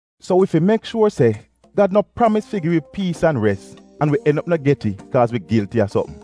So wi fi mek shuor se Gad no pramis fi gi wi piis an res an wi en op no get it kaaz wi gilti a sopm.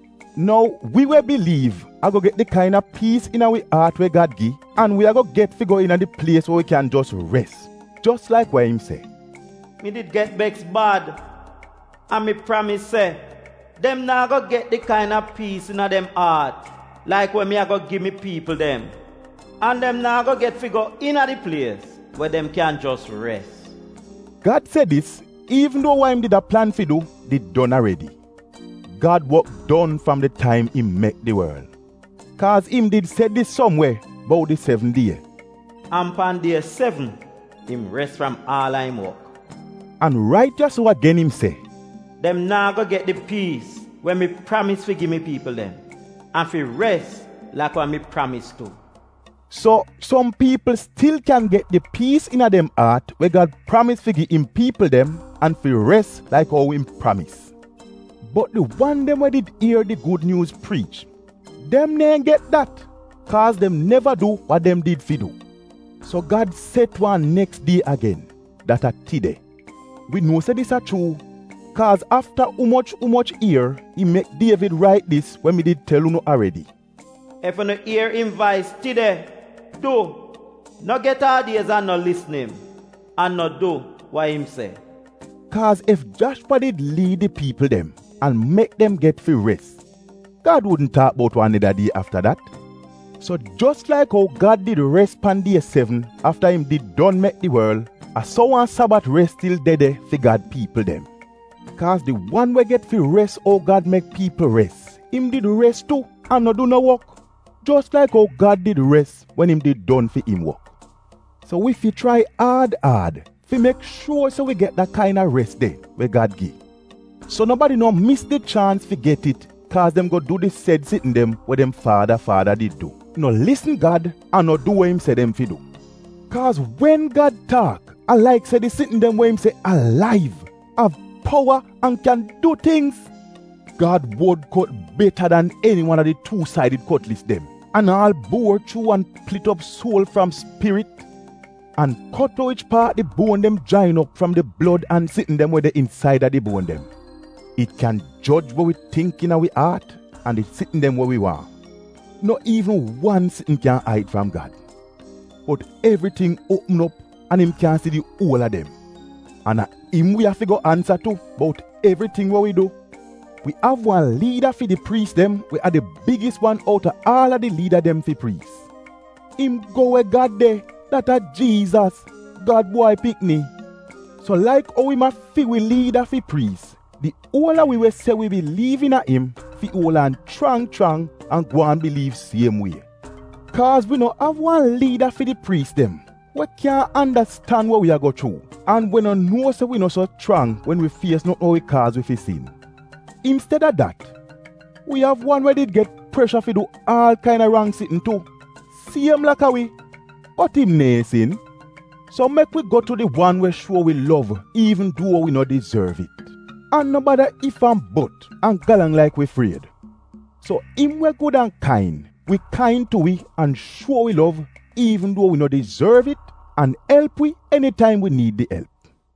Nou wi we biliiv ago get di kaina piis iina wi aat we Gad gi an wi ago get fi go iina di plies we wi kyan jos res. Jos laik wa im se, “Mi did get beks bad an mi pramis se, ‘Dem naa go get di kaina piis iina dem aat laik we mi ago gi mi piipl dem an dem naa go get fi go iina di plies we dem kyan jos res!’”. Gad se dis iivn duo wa im did a plan fi du did don aredi — Gad wok don fram di taim im mek di worl. Kaaz im did se dis som we bout di sevn die, ‘an pan die sevn im res fram aal a im wok’ An rait ya-so agen im se: “dem naa go get di piis we mi pramis fi gi mi piipl dem an fi res laik wa mi pramis tu.’” So, som piipl stil kyan get di piis iina dem aat we Gad pramis fi gi im piipl dem an fi res laik ou im pramis, bot di wan dem we did ier di Gud Nyuuz priich, dem neehn get dat, kaaz dem neva du wa dem did fi du. So Gad set wan neks die agen, dat a “tide.” Wi nuo se dis a chuu, kaaz afta umoch umoch ier im mek Dievid rait dis we mi did tel unu aredi, “Ef unu ier im vais tide, du, no get aad-iez an no lisn im an no du wa im se.” Kaaz ef Jashwa did liid di piipl dem an mek dem get fi res, Gad wudn taak bout wan neda die afta dat. So jos laik ou Gad did res pan die sevn afta im did don mek di worl, a so wan Sabat res stil de de fi Gad piipl dem. Kaaz di wan we get fi res ou Gad mek piipl res, im did res tu an no du no wok, jos laik ou Gad did res wen im did don fi im wok. So wi fi chrai aad aad fi mek shuor se wi get da kaina res de we Gad gi, so nobadi no mis di chaans fi get it kaaz dem go du di sed sitn dem we dem faada faada did du — no lisn Gad an no du wa im se dem fi du. Kaaz wen Gad taak, a laik se di sitn dem we im se alaiv, av powa an kyan du tingz! Gad wod kot beta dan eniwan a di tuu-saidid kotlis dem, an aal buor chuu an plit op suol fram spirit, an kot we wich paat di buon dem jain op fram di fati-fati sitn dem we de insaida di buon dem. It kyan joj we wi tingk iina wi aat an di sitn dem we wi waahn. No iivn wan sitn kyan aid fram Gad! Bot evriting uopm op an im kyan si di uol a dem, an a im wi afi go ansa tu bout evriting we wi du. Wi av wan liida fi di priis dem we a di bigis wan outa aal a di liida dem fi priis. Im go we Gad de — dat a Jiizas, Gad Bwai Pikni. So laik ou im a fi wi liida fi priis, di uol a wi we se wi biliiv iina im fi uol aan chrang chrang an gwaan biliiv siem wie. Kaaz wi no av wan liida fi di priis dem we kyaahn andastan we wi a go chuu, an we no nuo se wi no so chrang wen wi fies notn we wi kaaz wi fi sin. Insteda dat wi av wan we did get presha fi du aal kaina rang sitn tu siem laka wi — bot im neehn sin. Bot mek wi go tu di wan we shuo wi lov iivn duo wi no dizorv it, an no bada if-an-bot an galang laik wi fried, so im we gud an kain, wi kain tu wi an wi lov wi an elp wi enitaim wi niid di elp.